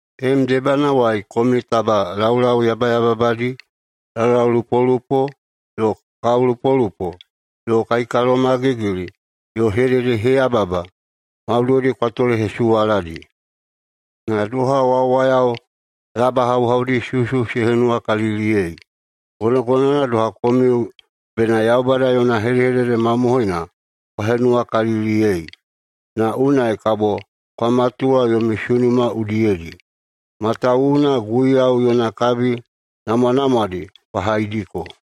Tenem debanawai komiu taba laulau yabayababadi, laulaulupolupo yo kaolupolupo yo kaikalomagigili yo hededeheyababa maudoidi kwa tolehesuwaladi. Na doha wawayao labahauhaudi susu se henuwakaliliyei, gonogonowana doha komiu bena Yaubada yona hedehedede mamohoina kwa henuwakaliliyei, na unai kabo kwa matuwa yomi sunuma udiyedi, matawuwuna Guiyau yona kabi namwanamwadi kwa haidiko.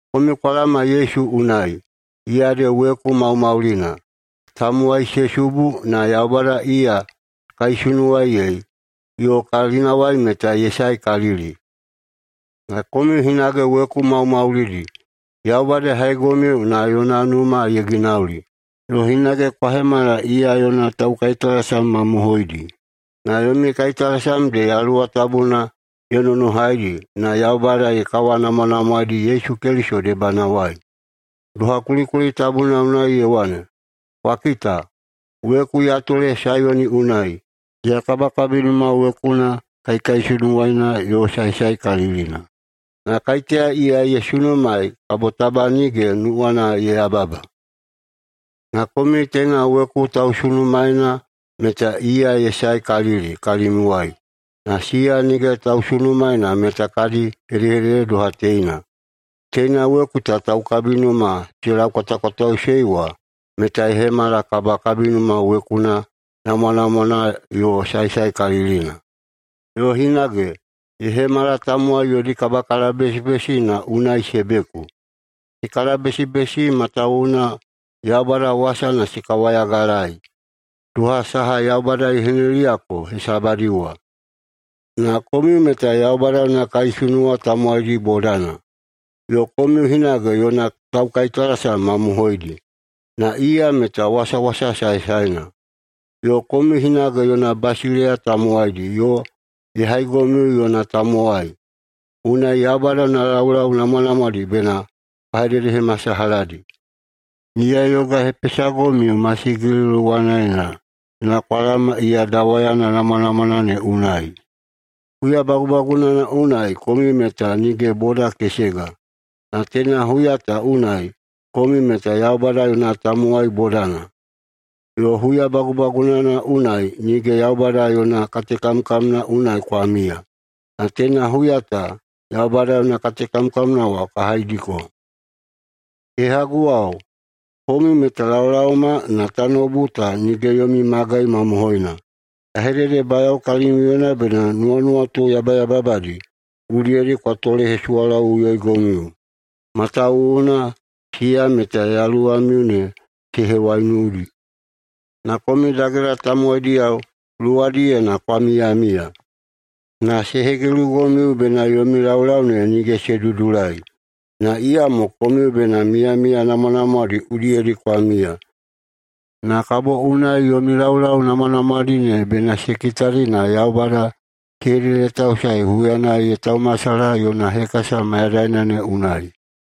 Komiu kwa laoma Yesu unai, iya ede weku maumaulina. Tamowai se subu, na Yaubada iya ye kaisunuwaei yo kalinawai meta ye saekalili. Na komiu hinage weku maumaulidi. Yaubada ye haigomiu na yona numa ye ginauli. Yo hinage kwa hemala iya yona taukaitalasam mamohoidi, na yomi kaitalasam ede Yaluwa Tabuna ye nonohaidi na Yaubada ye kawanamwanamwaeidi Yesu Keliso debanawai. Doha kulikuli tabuna unai ye wane, “Kwa kita, weku ya tole Saiyona unai, iya kabakabinuma wekuna kaikaisunuwana yo saesaekalilina, na kaiteya iya ye sunumaei kabo taba nige nuwana ye yababa.” Na komiu teina weku ta tausunumaeina meta iya ye saekalili kalimiuwai. Na siya nige tausunumaena meta kadi hedehedede doha teina: “Teina weku ta taukabinuma se laukwatakwataeiꞌusei wa meta ye hemala kabakabinuma wekuna namwanamwana yo saesaekalilina”, yo hinage, “ye hemala tamowai yodi kabakalabesibesi na unai se beku.” Se kalabesibesi matawuwuna Yaubada wasana se kawayagalaei, doha saha Yaubada ye hineliyako hesabadi wa. Na komiu meta Yaubada yona kaisunuwa tamowaidi bodana. Yo komiu hinage yona taukaitalasam mamohoidi, na iya meta wasawasa saesaena. Yo komiu hinage yona basileiya tamowaidi yo ye haigomiu yona tamowai. Unai Yaubada yona laulau namwanamwadi bena kwa hededehemasalahadi. Iya ye yogahepesagomiu masigili luwanaena na kwa laoma iya dawayana namwanamwana ne unai. Huya bagubagunana unai komiu meta nige boda kesega, na teina huya ta unai komiu meta Yaubada yona tamowai bodana. Yo huya bagubagunana unai nige Yaubada yona katekamkamna unai kwa miya, na teina huya ta Yaubada yona katekamkamna wa kwa haidiko. Kehaguwao, komiu meta laolaoma na tanoubu ta nige yomi magai mamohoina. Ya hededebayao kalimiuyena bena nuwanuwatu yabayababadi udiyedi kwa tolehesuwalaꞌuyoigomiu, matawuwuna siya meta yaluwamiu ne se hewaiunudi. Na komiu dagela tamowaidiyao luwadiyena kwa miyamiya, na se hegilugomiu bena yomi laulau ne nige se dudulai. Na iyamo komiu bena miyamiya namwanamwadi udiyedi kwa miya, na kabo unai yomi laulau namwanamwadi ne bena se kitadi na Yaubada se hededetausae huyana ye taumasalaha yona hekasa mayadaina ne unai.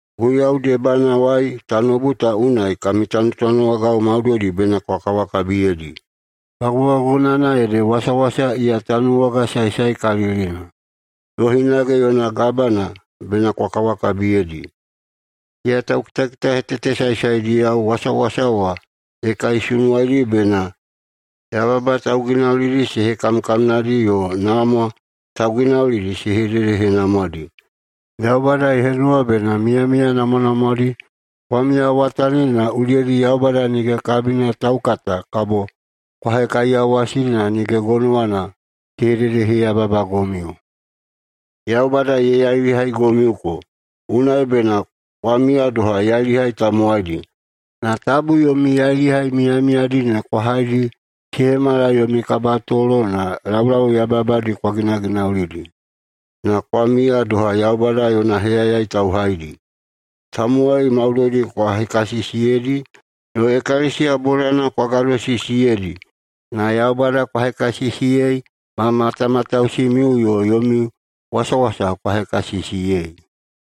Guiyau debanawai tanoubu ta unai kami tanutanuwagao maudoidi bena kwa kawakabiyeidi. Bagubagunana ede wasawasa iya tanuwaga saesaekalilina, yo hinage yona gabana bena kwa kawakabiyeidi. Siya taukitakitahetete saesaediyao wasawasa wa ye kaisunuwaidi bena yababa tauginaulidi se hekamkamnadi yo namwa tauginaulidi se hededehenamwadi. Yaubada ye henuwa bena miyamiya namwanamwadi kwa miyawatanidi na udiyedi Yaubada nige kabina taukata kabo kwa hekaiyawasidi na nige gonowana se hededeheyababagomiu. Yaubada ye yailihaigomiuko, unai bena kwa miya doha yailihai tamowaidi, na tabu yomi yailihai miyamiyadi ne kwa haidi se hemala yomi kabatolo na laulau yabayababadi kwa ginaginaulidi. Na kwa miya doha Yaubada yona heyayai tauhaidi. Tamowai maudoidi kwa hekasisiyeidi, yo ekalesiya bodana kwa gadosisiyeidi, na Yaubada kwa hekasisiyei ma matamatausimiu, yo yomi wasawasa kwa hekasisiyei.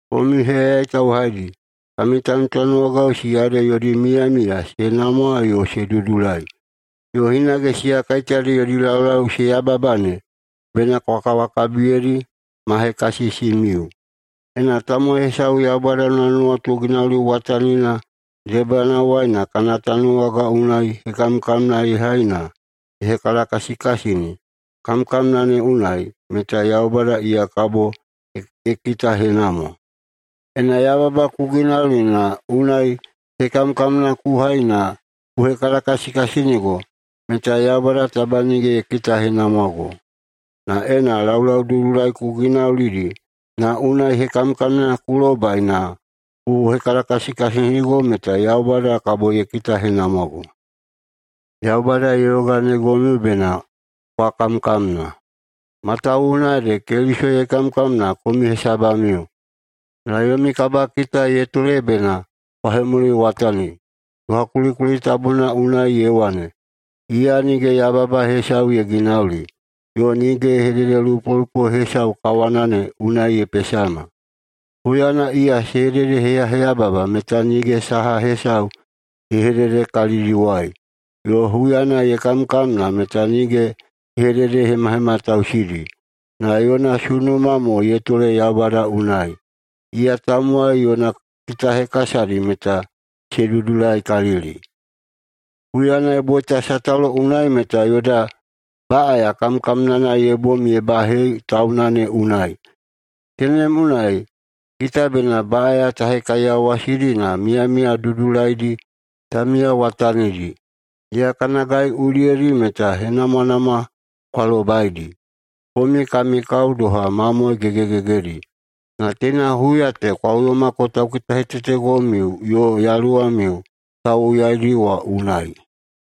Komiu heyayai tauhaidi, kami tanutanuwagao siya ede yodi miyamiya se namwa yo se dudulai, yo hinage siya kaiteyadi yodi laulau se yababa ne, bena kwa kawakabiyeidi ma hekasisimiu. Ena tamowai hesau Yaubada yona nuwatu ginauliwatanina debanawai na kana tanuwaga unai hekamkamna ye hai na ye hekalakasikasini kamkamna ne unai, meta Yaubada iya kabo ye kitahenamwa. Ena yababa ku ginauli na unai hekamkamna ku hai na ku hekalakasikasinigo meta Yaubada taba nige ye kitahenamwago. Na ena laulau dudulaidi ku ginaulidi na unai hekamkamna ku lobai na ku hekalakasikasinigo meta Yaubada kabo ye kitahenamwago. Yaubada ye yoganeigomiu bena kwa kamkamna. Matawuwuna ede Keliso ye kamkamna komiu hesabamiu, na yomi kabakita ye tole bena kwa hemuliwatani. [Doha kulikuli tabuna unai ye wane,] “Iya nige yababa hesau ye ginauli, yo nige hededelupolupo hesau kawana ne unai ye pesama.” Huyana iya se hededeheyababa meta nige saha hesau ye hedede kalidiwai, yo huyana ye kamkamna meta nige ye hededehemahematausidi. Na yona sunuma mo ye tole Yaubada unai, iya tamowai yona kitahekasadi meta se dudulaikalili. Huyana ye boita sataulo unai meta yoda baꞌaya kamkamnana ye bom ye bahei tauna ne unai. Tenem unai kita bena baꞌaya ta hekaiyawasidi na miyamiya dudulaidi ta miyawatanidi. Iya kana gai udiyedi meta henamwanamwa kwa lobaidi. Komiu kami kao doha mamoe gegegegedi. Na teina huya ta kwa uyomako taukitahetetegomiu yo yaluwamiu tauwoyaidi wa unai.